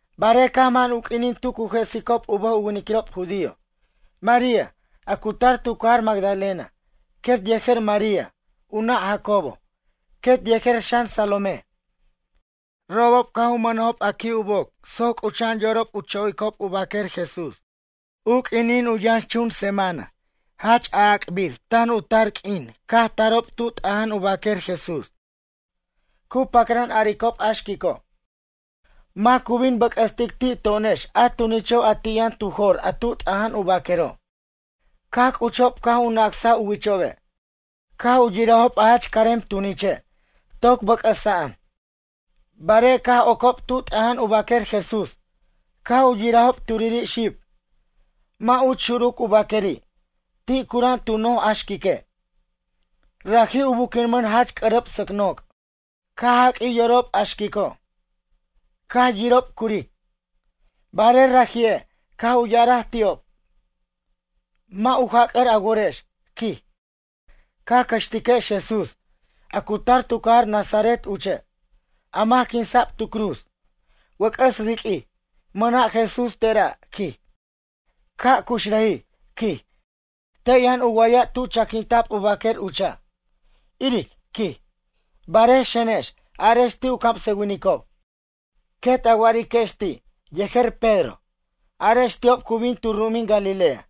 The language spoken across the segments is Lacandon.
Barej caj man u q'uinin tu cu jesicob u bʌj u winiquirob judío, María, a cu tar tu cajar Magdalena, quet yejer María, u nʌ' Jacobo, quet yejer xan Salomé, robob caj u mʌnajob a qui' u boc soc c'ucha'an yorob u chojicob u baquer Jesús. U q'uinin u yʌnxchun semana, jach a'ac'bir tan u tar q'uin caj tarob tu t'aja'an u baquer Jesús. Cu pacran a'aricob a xquico': ―Mac cu bin u bʌc'ʌstic ti' to'onex a tunicho' a ti' yʌn tu jor a tu t'aja'an u baquero'? Caj c'uchob caj u nacsaj u wichobe', caj u yirajob a jach carem tuniche', toc bʌc'ʌsa'an. Barej caj ocob tu t'aja'an u baquer Jesús, caj u yirajob turiri' xib, mʌ' uch xuruc u baqueri'. Ti' c'ura'an tu noj a xquique'. Raji' u buquinmʌn jach c'ʌrʌp sʌc noc'. Caj jaq'uij yorob a xquico', caj yirob curic. Barej raji'e', caj u ya'araj ti'ob: ―Mʌ' u jac'ʌr a worex ―quij―, ca cʌxtiquex Jesús, a cu tar tu cajar Nazaret uche', a mac quinsa'b tu cruz. Wʌc'ʌs riq'uij, mʌna' Jesús tera' ―quij―, ca' cuxrajij ―quij― te' yʌn u wa'aya' tu chaquinta'b u baquer ucha', iric ―quij―. Barej xenex, arex ti' u camsʌwinicob, quet a wa'ariquex ti', yejer Pedro: “Arex ti'ob cu bin tu ru'umin Galilea,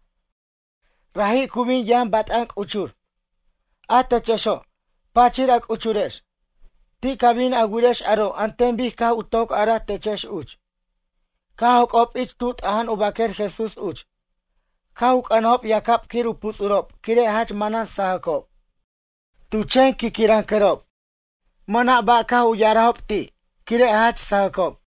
raji' cu bin yʌn bat'an c'uchur. A techexo', pachir a c'uchurex. Ti' ca bin a wirex aro' an ten bic caj u toc araj techex uch.” Caj joc'ob ich tu t'aja'an u baquer Jesús uch, caj u c'ʌnajob yacab quir u puts'urob quire' jach manan sajʌcob, tu chen quiquirʌncʌrob. Mʌna' ba' caj u ya'arajob ti', quire' jach sajʌcob.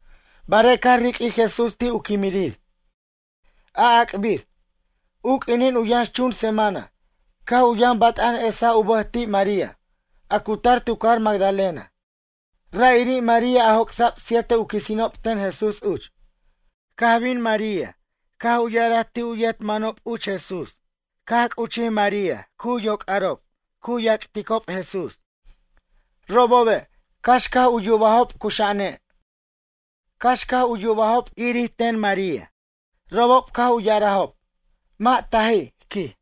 Barej caj riq'uij Jesús ti' u quimirir, a'ac'bir, u q'uinin u yʌnxchun semana, caj u yʌn bat'an esaj u bʌj ti' María, a cu tar tu cajar Magdalena, ra'iri' María a joc'sa'b siete u quisinob ten Jesús uch. Caj bin María, caj u ya'araj ti' u yet manob uch Jesús, caj c'uchij María cu yoc'arob, cu yacticob Jesús. Robobe', cax caj u yubajob cuxa'ane', cax yubobo' irir ten María. Robob caj u ya'arajob: ―Mʌ' taji' ―quij.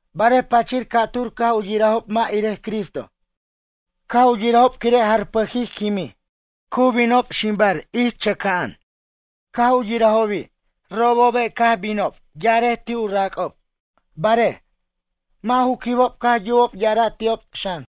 Barej pachir ca'tur caj u yirajob mʌ' irej Cristo, caj u yirajob quire' jarpʌjij quimij, cu binob ximbar ich chʌcʌn, caj u yirajobi'. Caj binob, robobe' ya'arej ti' u rac'ob, barej, mʌ' ju quibob caj yubob ya'ara' ti'ob, xan.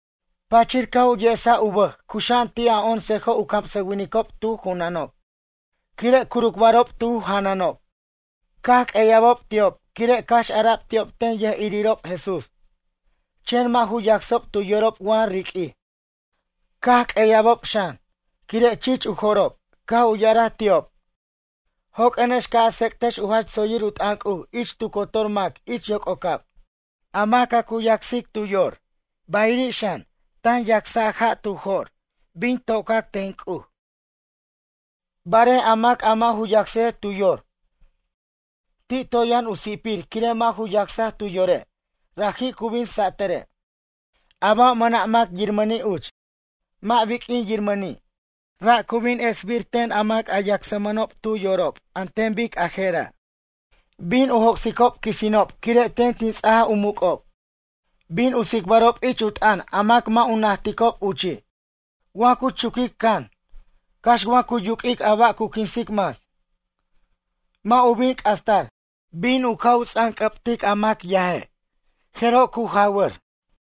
Pachir caj u yesaj u bʌj cuxa'an ti' a oncejo' u camsʌwinicob tu junanob, quire' curucbarob tu janʌnob. Caj q'ueya'bob ti'ob quire' cax ara'b ti'ob ten yʌjirirob Jesús, chen mʌ' ju yacsob tu yorob wa riq'uij. Caj q'ueya'bob xan, quire' chich u jo'rob. Caj u ya'araj ti'ob: ―Joq'uenex ca' a tsec'tex u jach tsoyir u t'ʌn C'uj ich tu cotor mac ich yoc'ocab. A mac a cu yacsic tu yor bayiri' xan, tan yacsa' ja' tu jo'r, bin tocac ten C'uj. Barej a mac a mʌ' ju yacsej tu yor, ti' toy yʌn u si'pir quire' mʌ' ju yacsaj tu yore', raji' cu bin satʌre'. A ba' mʌna' mac yirmʌni' uch, mʌ' biq'uin yirmʌni', ra' cu bin esbir ten an mac a yacsmʌnob tu yorob an ten bic a jera': Bin u joc'sicob quisinob quire' ten tin ts'aja u muc'ob. Bin u tsicbarob ich u t'ʌn a mac mʌ' u najticob uchi'. Wa cu chuquic can, cax wa cu yuq'uic a ba' cu quinsic mac, mʌ' u bin c'astar. Bin u cu ts'anc'ʌbtic a mac yaje', jeroj cu jawʌra'.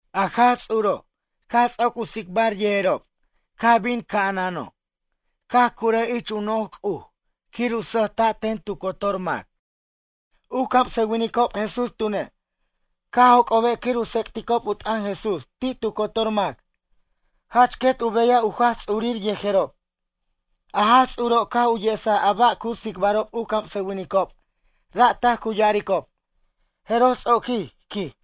A Jaj Ts'uro', caj ts'oc u tsicbar yejerob caj bin ca'anano', caj curaj ich u no'oj C'uj quir u sʌjta' ten tu cotor mac. U camsʌwinicob Jesús tune', caj joc'obe' quir u tsec'ticob u t'ʌn Jesús ti' tu cotor mac, jach quet u beyaj u Jaj Ts'urir yejerob. A Jaj Ts'uro' caj u yesaj a ba' cu tsicbarob u camsʌwinicob ra' taj cu ya'aricob. Jeroj Ts'oquij, quij.